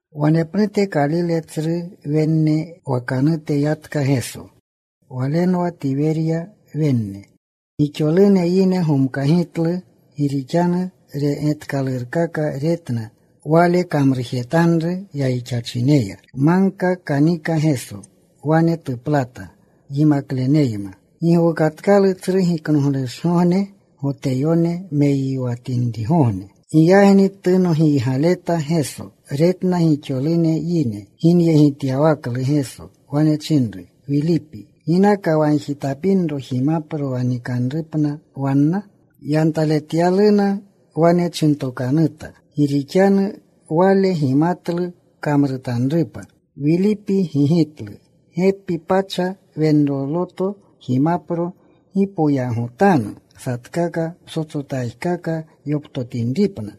Wanepnute Kalile tsru wenne wakanute yatka Geso. Walenwa Tiwerya wenne. Gixolune yine gomkagitlu, gi rixanu getkalurkaka retna, Wale kamrujetanru yayixachineya. Magka kanika Geso. Wane tuplata yimakleneyma. Gi gowukatkalu Tsru Giknoglushgogne, Goteyone meyiwatinrigogne. Giyagni tunogiygaleta Geso. Retna gixolune yine ginyegityawaklu. Geso wane chinru Wilipi, “¿Ginaka wagjitapinro jimapro wa nikinripna wanna?” Yantaletyalu wane chintokanuta, gi rixanu Wale gimatlu kamrutanrupa. Wilipi gigitlu, “Gepi pacha wenroluto jimapro gi poyagotanu satkaka ptsotsotajkaka yoptotinripna.”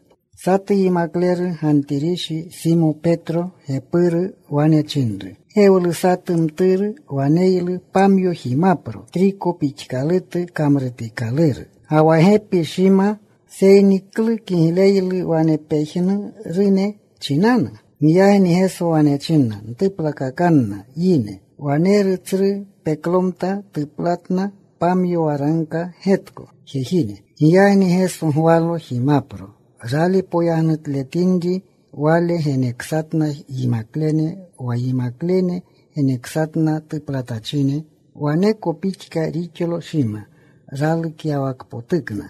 Satu yimakleru Gantirishi, Simo Petro gepuru, wane chinru, “Gewlu satu mturu waneylu pamyo jimapro triko pixkalutu kamrutikaluru, ga wa gepi shima. Seyni ¿klu kigleylu wane pejnurune chinanu?” Giyagni Geso wane china, “Ntuplakakanna yine.” Waneru tsru peklomta. Tuplatna. Pamyo waragka getko jejine. Giyagni Geso gwalo jimapro. Rali poyagnutletinri, Wale geneksatna yimaklene. Wa yimaklene geneksatna tuplatachine. Waneko pixka rixlo shima ralukyawakpotukna.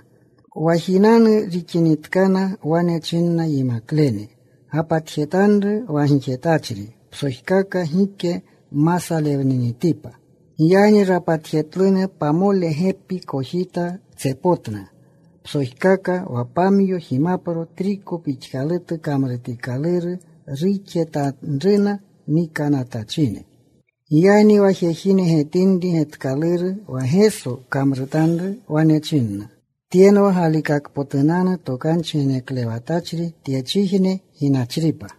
Wa jinanu rixinitkana, wane chinna yimaklene, “Gapatjetanru wa gixetachri psojkaka gike ma salewninitipa.” Giyagni rapatjetluna. Pamole gepi kojita tsepotna psojkaka wa pamyo jimapro triko pixkalutu kamrutikaluru, ruxetanruna nikanatachine. Giyagni wa jejine getinri getkaluru wa Geso kamrutanru, wane chinna, “Tyenwa galikakpotunanu tokanchi geneklewatachri tyechijne ginachripa.”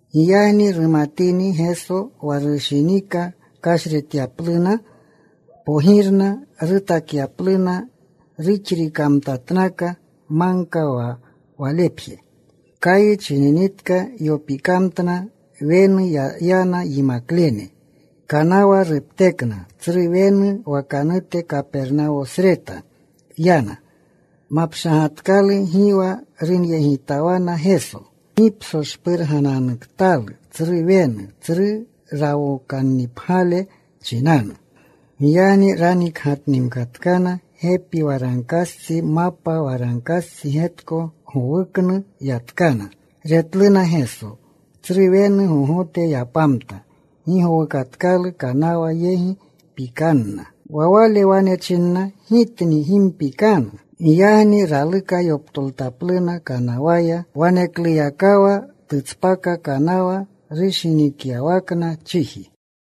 Giyagni rumatini Geso wa rushinika kashretyapluna pogirna rutakyapluna, ruxrikamtatnaka. Magka ya Walepje. Kayi chininitka. Yopikamtna. Wenu yana yimaklene. Kanawa ruptekna. Tsru wenu wakanute, Kapernawosreta, yanna. Mapshagatkalu. Gi wa runyegitawana Geso. ¡Gi psoshpurgananuktalu tsru wenu, tsru rawokannipgyale chinanu! Giyagni ranikgatnimkatkana. Gepi waragkastsi, mapa waragkastsi getko gowuknu yatkana. Retluna Geso. Tsru wenu gogote yapamta. Gi gowukatkalu kanawa yegi. Pikanna. Wa Wale wane chinna, “Gitni. Gi mpikanu.” Giyagni raluka yoptoltapluna kanawaya. Wanekluyakawa tutspaka kanawa rushinikyawakna chiji.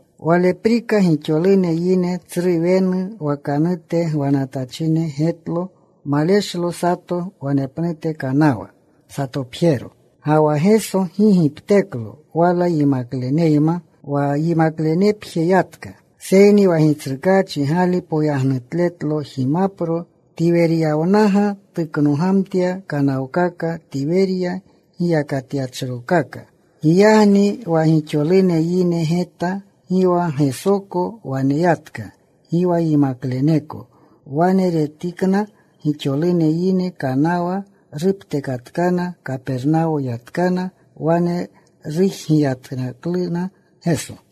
Waleprika gixolune yine tsru wenu wakanute gwachine getlo maleshlo sato wanepnute kanawa. Satopjero. Ga wa Geso gi gipteklo wala yimakleneyma. Wa yimaklenepje yatka. Seyni wa Gitsrukaachi gali poyagnutletlo jimapro, Tiweryawnaga tuknogamtya kanawkaka. Tiwerya giyakatyachrokaka. Giyagni wa gixolune yine geta gi wa Gesoko wanetka, gi wa yimakleneko. Wane retinitkana gixolune yine, kanawa ruptekatkana. Kapernawo yatkana. Wane rujgiyatkaluna Geso.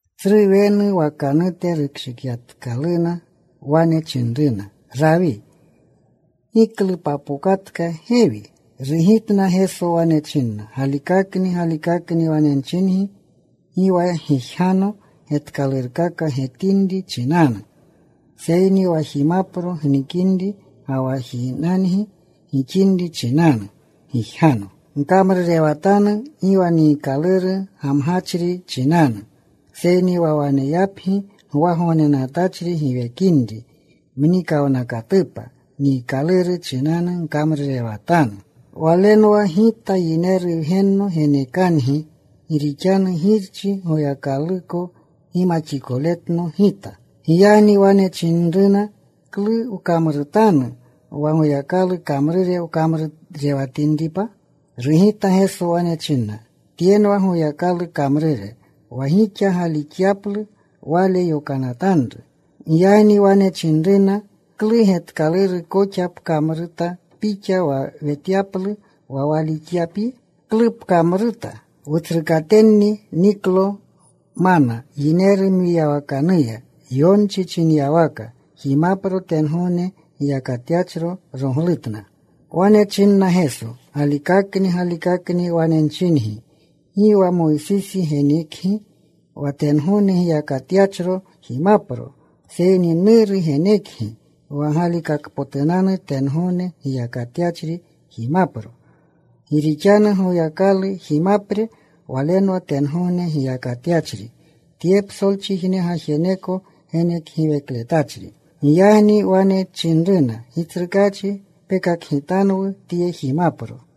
Tsru wenu wakanute rukshikinitkaluna, wane chinruna, “Rawi, ¿Giklu papokatka gewi?” Rugitna Geso. Wane china, “Galikakni, galikakni wane nchingi, gi wa gijgano getkalurkaka getinri chinanu, seyni wa jimapro gnikinri ga wa jinangi gixinri chinanu gijgano. Gkamrurewatanu gi wa niikaluru gamgachri chinanu, seyni wa waneyapgi gwagognenatachri giwekinri mnikawnakatupa niikaluru chinanu gkamrurewatanu. Walenwa Gita Yineru Wgenno genekangi. Gi rixanu Girchi, Goyakaluko gimaxikoletno Gita.” Giyagni wane chinruna, “¿Klu wkamrutanu wa Goyakalu kamrure wkamruretinripa?” Rugita Geso. Wane chinna, “Tyenwa Goyakalu kamrure, wa gixa galixyaplu Wale yokanatanru.” Giyagni wane chinruna, “¿Klu getkaluru koxa pkamruta Pixa wa wetyaplu, wa walixyapyi? ¿Klu pkamruta? Wutsrukatenni niklo mana yineru mwiyawakanuya, yonchi chinyawaka: Jimapro tengogne giyakatyachro roglutna.” Wane chinna Geso, “Galikakni, galikakni wane nchingi, gi wa Moysisi genekgi wa tengogne giyakatyachro jimapro, seyni Nuru genekgi wa galikakpotunanu tengogne giyakatyachri jimapro. Gi rixanu Goyakalu jimapre Walenwa tengogne gijrukyachri, tye psolchijne gajeneko genekgiwekletachri.” Giyagni wane chinruna, “Gitsrukaachi, penekjetanwu tye jimapro.”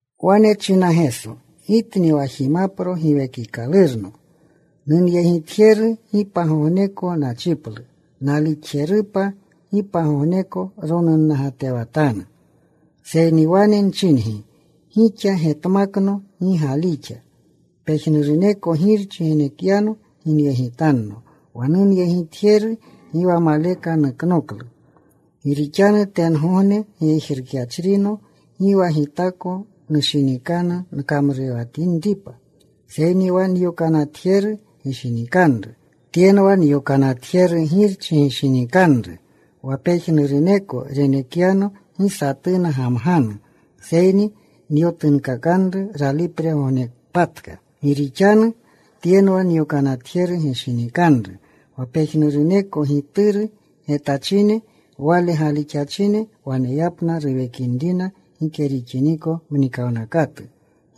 Wane chinna Geso, “Gitni wa jimapro giwekikalurno. Nunyegitjeru gi pagogneko nachiplu. Nalixjerupa gi pagogneko ronunnagatewatanu. Seyni wane nchingi gixa, getmakno. Gi galixa. Pejnuruneko Girchi genekyano ginyegitanno. Wa nunyegitjeru gi wa maleka nuknoklu. Gi rixanu tengogne gijrukyachrino gi wa Gitako nushinikanru nkamrutinripa, seyni wa nyokanatjeru gishinikanru. Tyenwa nyokanatjeru Girchi gishinikanru, wa pejnuruneko renekyano gi satuna gamganu, seyni nyotunkakanru ralipregognepatka. Gi rixanu tyenwa nyokanatjeru gishinikanru, wa pejnuruneko Gituru getachine, Wale galixachine waneyapna ruwekinrina gike rixiniko mnikawnakatu.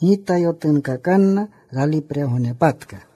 Gita yotunkakanna ralipregognepatka.”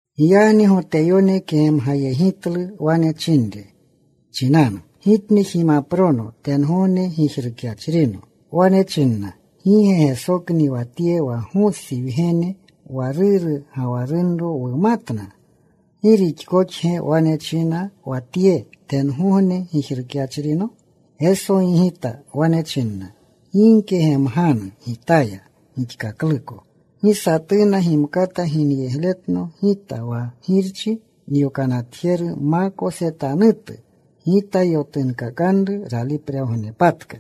Giyagni Goteyone kegemgayegitlu wane chinre chinanu, “Gitni jimaprono tengogne gijrukyachrino.” Wane chinna, “¿Gi ge Gesokni wa tye, wa Gosi wgene, wa ruru, ga wa runro wumatna? ¿Gi rixkoxge wane china wa Tye, ‘Tengogne gijrukyachrino?’” Geso gigita. Wane chinna, “Gi gkegemganu Gitaya gixkakluko. Gi satuna gimkata ginyegletno Gita wa Girchi nyokanatjeru ma kosetanutu. Gita yotunkakanru ralipregognepatka.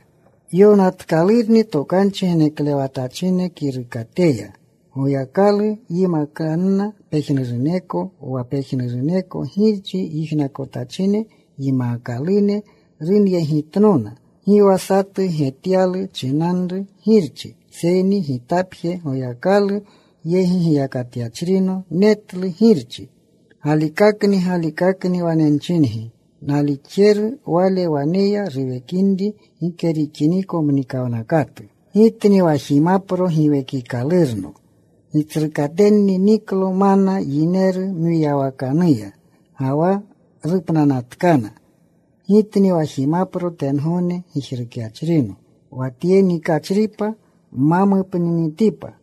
“Yonatkalurni tokanchi geneklewatachine kirukateya: Goyakalu yimakanna pejnuruneko. Wa pejnuruneko Girchi yijnakotachine, yimaakalune runyegitnona. Gi wa satu getyalu chinanru Girchi, seyni Gitapje Goyakalu yegi giyakatyachrino netlu Girchi. Galikakni, galikakni wane nchingi, nalixjeru wale waneya ruwekinri gike rixiniko mnikawnakatu. Gitni wa jimapro giwekikalurno. Gitsrukatenni niklo mana yineru mwiyawakanuya, ga wa rupnanatkana. Gitni wa jimapro tengogne gijrukyachrino, wa tye nikachripa ma mupninitipa.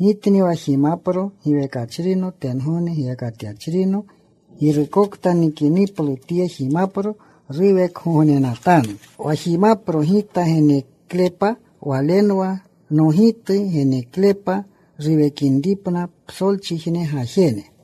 Gitni wa jimapro giwekachrino, tengogne gijrukyachrino. Girukokta nikiniplu tye jimapro ruwekgognenatanu. Wa jimapro Gita geneklepa walenwa nogitu neneklepa ruwekinripna psolchijne gajene.”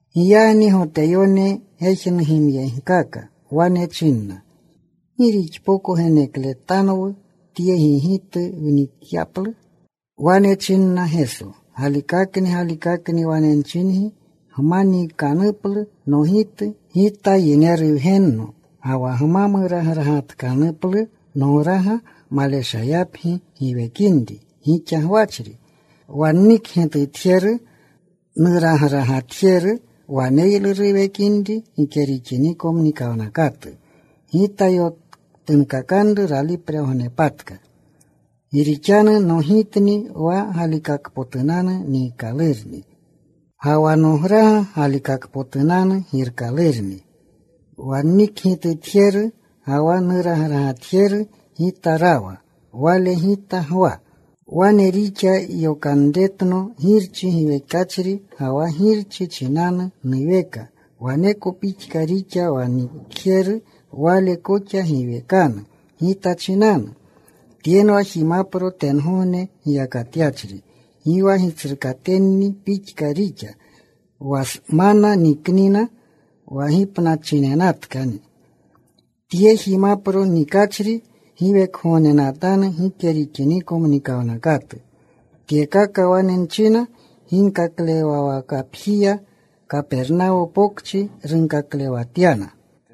Giyagni Goteyone gejnugimyegkaka. Wane chinna, “¿Gi rixpoko genekletanwu Tye gigitu wnikyaplu?” Wane chinna Geso, “Galikakni, galikakni wane nchingi, gma niikanuplu nogitu, Gita Yineru Wgenno ga wa gma muragragatkanuplu nograga, maleshayapgi giwekinri gixa gwachri. Wa nnikgitutjeru, nuragragatjeru waneylu ruwekinri gike rixiniko mnikawnakatu. Gita yotunkakanru ralipregognepatka. Gi rixanu nogitni wa galikakpotunanu niikalurni, ga wa nograga galikakpotunanu girkalurni. Wa nnikgitutjeru, ga wa nuragragatjeru Gita rawa. Wale Gita gwa. Wane rixa yokanretno Girchi giwekachri, ga wa Girchi chinanu nuweka, waneko pixka rixa wa nnikjeru. Wale koxa giwekanu Gita chinanu. Tyenwa jimapro tengogne gijrukyachri. Gi wa gitsrukatenni pixka rixa, wa mana nikna. Wa gipnachinenatkani. Wa tye jimapro nikachri giwekgognenatanu gike rixiniko mnikawnakatu.” Tyekaka wane china ginkaklewwakapjiya, Kapernawo Pokchi runkaklewanatya.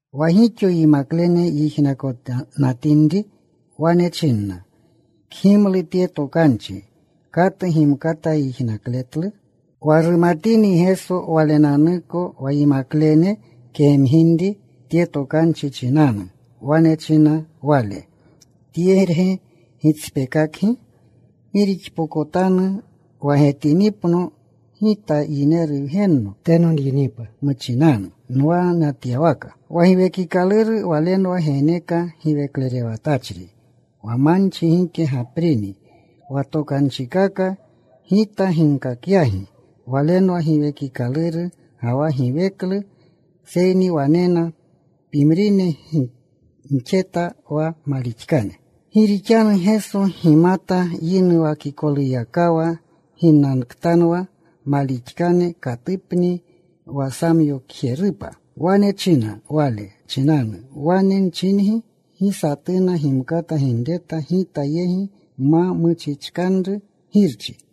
Wa gixo yimaklene yijnakonatinri, wane chinna, “Kgimlu tye tokanchi. ¿Katu gimkata yijnakletlu?” Wa rumatini Geso Walenanuko wa yimaklene kegemginri tye tokanchi chinanu, wane chinna Wale, “¿Tyerge gitspeekakgi? ¿Gi gixpokotanu wa getinipno Gita Yineru Wgenno teno nyinipa muchinanu nwanatyawaka? Wa Giwekikaluru Walenwa geneka giweklerewatachri. Wa manchi gike gaprini. Wa tokanchikaka Gita ginkakyagi, walenwa giwekikaluru ga wa giweklu. Seyni wanena pimrine gixate wa malixkane.” Gi rixanu Geso gimata yinuwakikoluyakawa ginnaktanwa malixkane, katupni wa samyokjerupa. Wane china, “Wale chinanu wane nchingi, gi satuna gimkata ginreta Gita yegi ma muchichkanru Girchi.”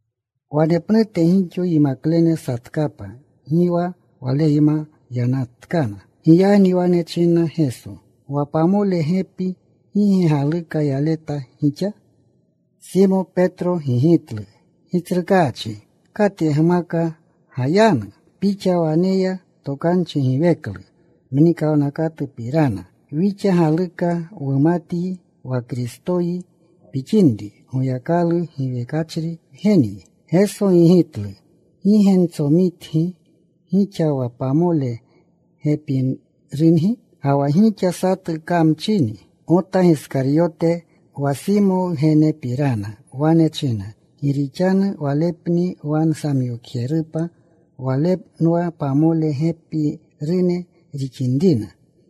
Wanepnute gixo yimaklene satkapa. Gi wa Waleyma yanatkana. Giyagni wane chinna Geso wa pamole gepi, “¿Gi ge galuka yaleta gixa?” Simo Petro gigitlu, “Gitsrukaachi, ¿katyegmaka gayanu? Pixa waneya tokanchi giweklu mnikawnakatupirana. Wixa galixa. Wumatyi wa Kristoyi pixinri, Goyakalu giwekachri Wgenyi.” Geso gigitlu, “¿Gi ge ntsomitgi gixa wa pamole gepirungi? Ga wa gixa satu kamchini.” Gota Giskaryote wa Simo wgenepiranni wane china, gi rixanu walepni wa samyokjerupa. Walenwa pamole gepirune rixinrina.